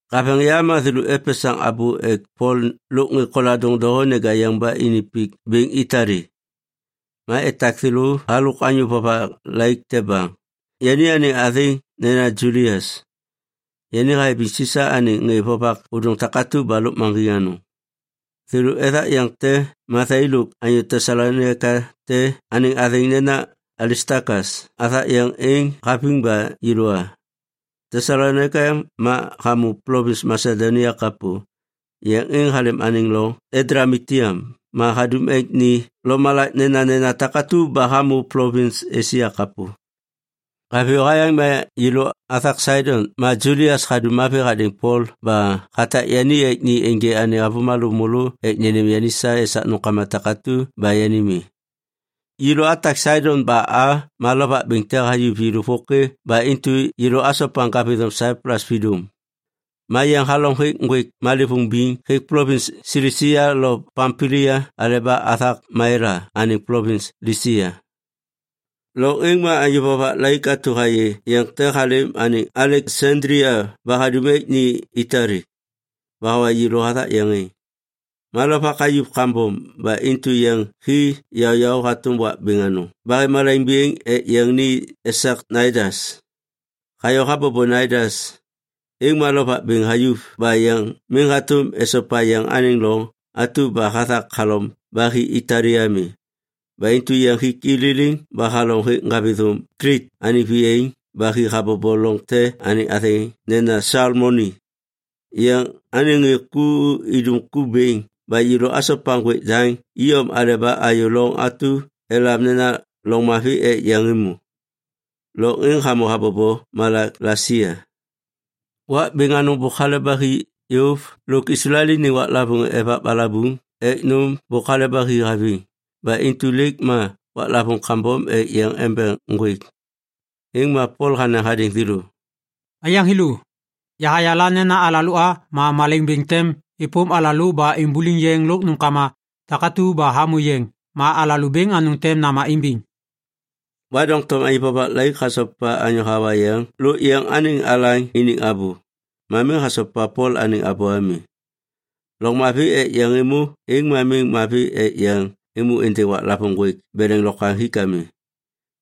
Haveŋ yam ma thêlô epesaŋ abô ek Pol lôk ŋê koladôŋ doho neja yeŋ ba ini pik bêŋ Itali. Ma etak thêlô halôk anyô vovak laik te baŋ, yani anêŋ athêŋ nena Julias. Yani hayabiŋ Sisa anêŋ ŋê vovak ôdôŋ takatu ba lôkmaŋgiŋ anôŋ. Thêlô ethak yeŋ te ma yai lôk anyô Tesalonaika te anêŋ athêŋ nena Alistakas athak yeŋ êŋ haviŋ ba yêlô a. Tesalonaika ma hamô plovins Masedonia kapô. Yeŋ êŋ halêm anêŋ loŋ Adlamitiam ma hadum ek ni lomalak nenanena takatu ba hamô plovins Esia kapô. Haviyô hayaŋ ma yêlô athak Saidon ma Julias hadum mavi hadêŋ Pol ba hatak yani ek ni ênjê anêŋ avômalô môlô ek nênêm yani sa esak nômkama takatu ba yani mi. Yêlô atak Saidon ba a ma lovak bêŋ te hayuv yêlô vôkê ba intu yêlô asopa Ŋgavithôm Saiplus vidôm. Ma yeŋ halom hêk ŋgwêk malêvôŋ biŋ hêk plovins Silisia lo Pampilia aleba athak Maila anêŋ plovins Lisia. Loŋ êŋ ma anyô vovak laik atu hayê yeŋ te halêm anêŋ Aleksandlia ba hadum ek ni Itali. Ba hawa yêlô hathak yeŋ êŋ. Ma lovak hayuv kambom ba intu yeŋ hi yaôyaô hatôm wak bêŋ anôŋ ba hêv malaiŋ bêŋ ek yeŋ ni esak Naidas. Hayô habobo Naidas, êŋ ma lovak bêŋ hayuv ba yeŋ miŋ hatôm esopa yeŋ anêŋ loŋ atu ba hathak halom ba hi Itali ami. Ba intu yeŋ hik i liliŋ ba halom hêk Ŋgavithôm Klit anêŋ viyaiŋ ba hi habobo loŋ te anêŋ athêŋ nena Salmoni. Yeŋ anêŋ ŋê ku idum ku bêŋ ba yêlô asopa ŋgwêk daŋ iyom aleba ayô loŋ atu elam nena Loŋ Mavi Ek Yeŋ Êmô. Loŋ êŋ hamô habobo malak Lasia. Wak bêŋ anôŋ bôk hale ba hi yôv lôk Islael iniŋ waklavôŋ Evak Balabuŋ Ek Nôm bôk hale ba hi haviŋ ba intu lêk ma waklavôŋ kambom ek yeŋ embeŋ ŋgwêk. Êŋ ma Pol hanaŋ hadêŋ thêlô, “Aiyaŋ thêlô, yahayala nena alalô a ma malaiŋ bêŋ tem êpôm alalô ba imbuliŋ yeŋ lôk nômkama takatu ba hamô yeŋ ma alalô bêŋ anôŋ tem nama imbiŋ.” Ma doŋtom anyô vovak laik hasopa anyô hawa yeŋ lôk yeŋ anêŋ alaŋ iniŋ abô, ma miŋ hasopa Pol anêŋ abô ami. Loŋ Mavi Ek Yeŋ Êmô êŋ ma miŋ mavi ek yeŋ êmô êndêŋ waklavôŋ ŋgwêk beleŋ lokwaŋ hik ami.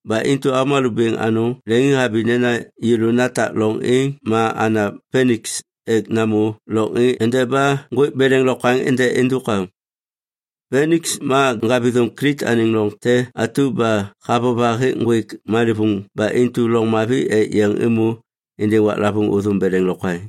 Ba intu avômalô bêŋ anôŋ leŋiŋhabi nena yêlô natak loŋ êŋ ma ana Piniks ek namô loŋ êŋ endeba ŋgwêk beleŋ lokwaŋ ende êndôk am. Piniks ma Ŋgavithôm Klit anêŋ loŋ te atu ba havova hêk ŋgwêk malêvôŋ ba intu loŋ mavi ek yeŋ êmô êndêŋ waklavôŋ ôthôm beleŋ lokwaŋ.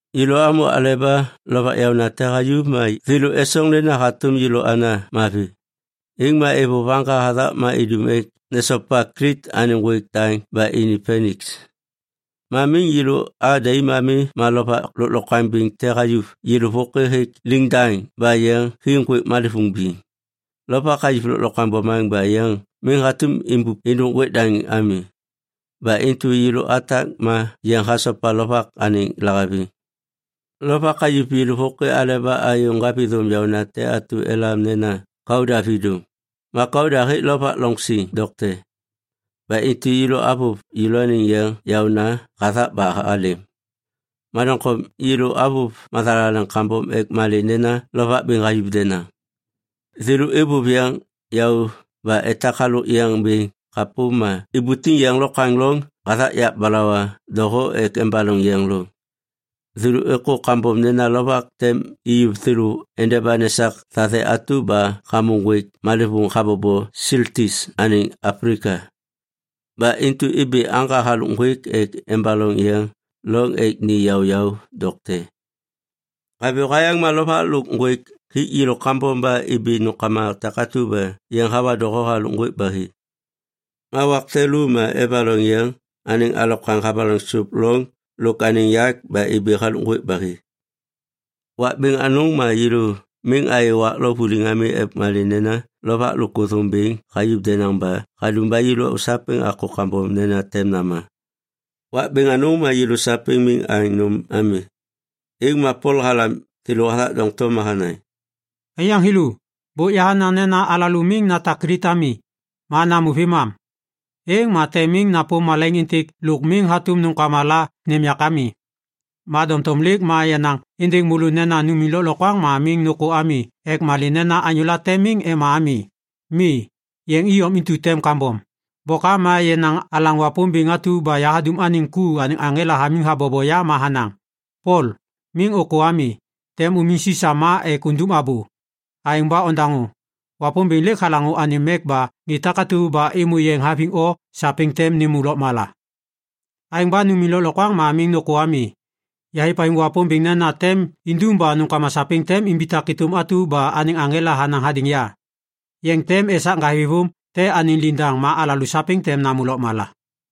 Yêlô amô aleba lovak yaônate hayuv ma thêlô esoŋ nena hatôm yêlô ana mavi. Êŋ ma êvôv aŋga hathak ma idum ek nesopa Klit anêŋ ŋgwêk daŋ ba ini Piniks. Ma miŋ yêlô a daim ami ma lovak lôklokwaŋ bêŋ te hayuv yêlô vôkê hêk liŋdaŋ ba yeŋ hi ŋgwêk malêvôŋ biŋ. Lovak hayuv lôklokwaŋ bomaŋ ba yeŋ miŋ hatôm imbup êndôk ŋgwêk daŋ ami. Ba intu yêlô atak ma yeŋ hasopa lovak anêŋ lahaviŋ. Lovak hayuv yêlô vôkê aleba ayô ŋgavithôm yaônate atu elam nena Kauda vidôm. Ma Kauda hêk lovak loŋ siŋ dokte. Ba intu yêlô avôv yêlôaniŋ yeŋ yaôna hathak ba halêm. Ma doŋtom yêlô avôv mathalaleŋ kambom ek malê nena lovak bêŋ hayuv denaŋ. Thêlô êvôv yeŋ yaô ba etak halôk yeŋ bêŋ kapô ma ibutiŋ yeŋ lokwaŋ loŋ hathak yak balawa doho ek embaloŋ yeŋ loŋ. Thêlô êkô kambom nena lovak tem iyuv thêlô endeba nesak thathe atu ba hamô ŋgwêk malêvôŋ habobo Siltis anêŋ Aplika. Ba intu ibi aŋga halôk ŋgwêk ek embaloŋ yeŋ loŋ ek ni yaôyaô dokte. Haviyô hayaŋ ma lovak lôk ŋgwêk hik yêlô kambom, ba ibi nômkama takatu ba yeŋ hawa doho halôk ŋgwêk ba hi. Ma wak te lô ma evaloŋ yeŋ anêŋ alokwaŋ havaloŋ sôp loŋ lôk anêŋ yak ba ibi halôk ŋgwêk ba hi. Wak bêŋ anôŋ ma yêlô miŋ ayê wak lo vuliŋ ami ek malê nena lovak lôk ôthôm bêŋ hayuv denaŋ ba hadum ba yêlô sapêŋ akô kambom nena tem nama. Wak bêŋ anôŋ ma yêlô sapêŋ miŋ aŋ nôm ami, êŋ ma Pol halam thêlô hathak doŋtom ma hanaŋ, “Aiyaŋ thêlô, bôk yahanaŋ nena miŋ alalô natak Klit ami, ma namô vêmam. Êŋ ma tem miŋ napôm malaiŋ êntêk lôk miŋ hatôm nômkama la nêm yak ami. Ma doŋtom lêk ma yanaŋ êndêŋ môlô nena numiŋ lôklokwaŋ ma miŋ nôkô ami ek malê nena anyôla tem miŋ ema ami. Mi, yeŋ iyom intu tem kambom. Bôkam ma yenaŋ alaŋ Wapômbêŋ atu ba yahadum anêŋ ku anêŋ aŋela hamiŋ habobo ya ma hanaŋ, ‘Pol, miŋ ôkô ami. Tem umiŋ Sisa ma ek undum abô. Aêŋ ba ondaŋô. Wapômbêŋ lêk halaŋô anêm mek ba ŋê takatu ba êmô yeŋ haviŋ o, sapêŋ tem nêmô lôkmala.’ Aêŋ ba numiŋ lôklokwaŋ ma miŋ nôkô ami! Yahêvhaviŋ Wapômbêŋ nena tem indum ba nômkama sapêŋ tem imbitak êtôm atu ba anêŋ aŋela hanaŋ hadêŋ ya. Yeŋ tem esak ŋgavithôm te anêŋ liŋdaŋ ma alalô sapêŋ tem namô lôkmala.”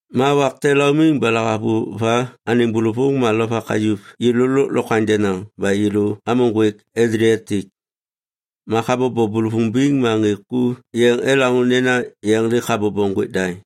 Ma wak te laumiŋ ba lahavuva anêŋ bôlôvôŋ ma lovak hayuv yêlô lôklokwaŋ denaŋ ba yêlô amô Ŋgwêk Adliatik. Ma habobo bôlôvôŋ biŋ ma ŋê ku yeŋ elaŋô nena yeŋ lêk habobo ŋgwêk daŋ.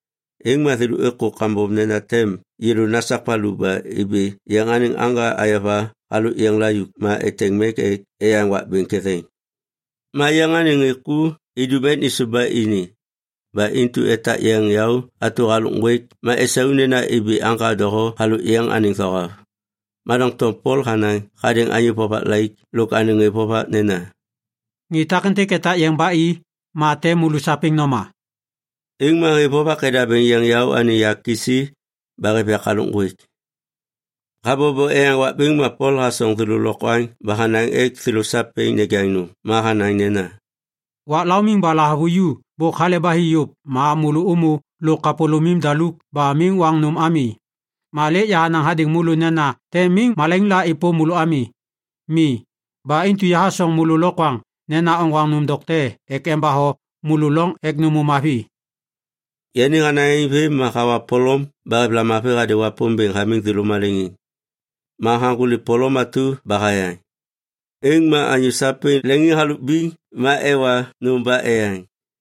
Êŋ ma thêlô êkô kambom nena tem yêlô nasak valu ba ibi yeŋ anêŋ aŋga ayova halôk yeŋ layuk ma eteŋ mek ek eyaŋ wak bêŋ ketheŋ. Ma yeŋ anêŋ ŋê ku idum ek nêsôv ba ini. Ba intu etak yeŋ yaô atu halôk ŋgwêk ma esau nena imbi aŋga doho halôk yeŋ anêŋ thohav. Ma doŋtom Pol hanaŋ hadêŋ anyô vovak laik lôk anêŋ ŋê vovak nena, “Ŋê takêntêk etak yeŋ ba i, ma tem môlô sapêŋ noma.” Êŋ ma ŋê vovak edabêŋ yeŋ yaô anêŋ yak kisi ba hêv yak halôk ŋgwêk. Habobo eyaŋ wak bêŋ ma Pol hasoŋ thêlô lokwaŋ ba hanaŋ ek thêlô sapêŋ nejaŋ nôm. Ma hanaŋ nena, “Wak laumiŋ ba lahavuva bôk hale ba hi yôv ma môlô ômô lôk kapôlômim daluk ba miŋ oaŋ nôm ami. Ma lêk yahanaŋ hadêŋ môlô nena tem miŋ malaiŋ la êpôm môlô ami. Mi. Ba intu yahasoŋ môlô lokwaŋ nena oŋgwaŋ nôm dokte ek embatho môlô loŋ ek nômô mavi.” Yani hanaŋ aêŋ vêm ma hawa polom ba hêv lamavi hadêŋ Wapômbêŋ hamiŋ thêlô maleŋiŋ. Ma haŋgôli polom atu ba hayaŋ. Êŋ ma anyô sapêŋ leŋiŋ halôk biŋ ma ewa nôm ba eyaŋ.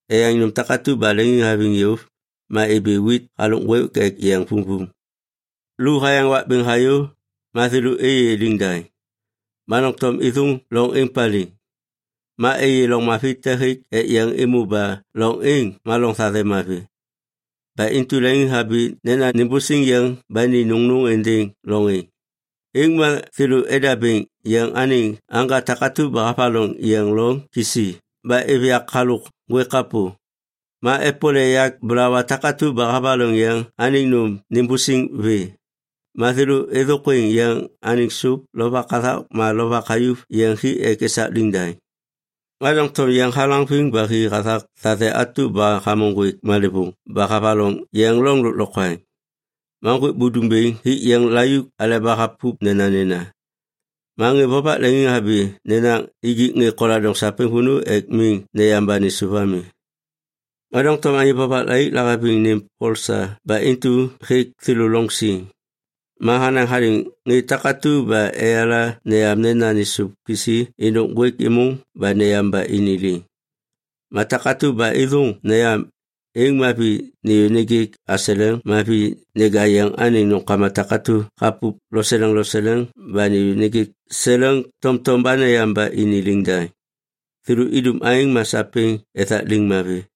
Eyaŋ nôm takatu ba leŋiŋhaviŋ yôv, ma ibi wit halôk ŋgwêk ek yeŋ vumvum. Lu hayaŋ wak bêŋ hayô, ma thêlô êyê liŋdaŋ, ma doŋtom êthôŋ loŋ êŋ paliŋ. Ma êyê loŋ mavi te hêk ek yeŋ êmô ba loŋ êŋ ma loŋ thathe mavi. Ba intu leŋiŋhabi nena nimbusiŋ yeŋ ba ni nôŋnôŋ êndêŋ loŋ êŋ. Êŋ ma thêlô edabêŋ yeŋ anêŋ aŋga takatu ba havaloŋ yeŋ loŋ kisi ba êv yak halôk ŋgwêk kapô. Ma epole yak balawa takatu ba havaloŋ yeŋ anêŋ nôm nimbusiŋ vê. Ma thêlô êthôkwêŋ yeŋ anêŋ sôp lovak hathak ma lovak hayuv yeŋ hi ek esak liŋdaŋ. Ma doŋtom yeŋ halaŋviŋ ba hi hathak thathe atu ba hamô ŋgwêk malêvôŋ ba havaloŋ yeŋ loŋ lôklokwaŋ. Ma ŋgwêk budum bêŋ hik yeŋ layuk aleba hapup nenanena. Ma ŋê vovak leŋiŋhabi nena nijik ŋê koladôŋ sapêŋ vônô ek miŋ neyam ba nêsôv ami. Ma doŋtom anyô vovak laik lahaviŋ nêm Pol sa ba intu hêk thêlô loŋ siŋ. Ma hanaŋ hadêŋ ŋê takatu ba eyala neyam nena nêsôv kisi êndôk ŋgwêk êmôŋ ba neyam ba ini liŋ. Ma takatu ba êthôŋ neyam, êŋ ma vi nêyô nêjêk aseleŋ ma vi neja yeŋ anêŋ nômkama takatu hapup loseleŋ loseleŋ ba nêyô nêjêk seleŋ tomtom ba neyam ba ini liŋdaŋ. Thêlô idum aêŋ ma sapêŋ ethak liŋ mavi.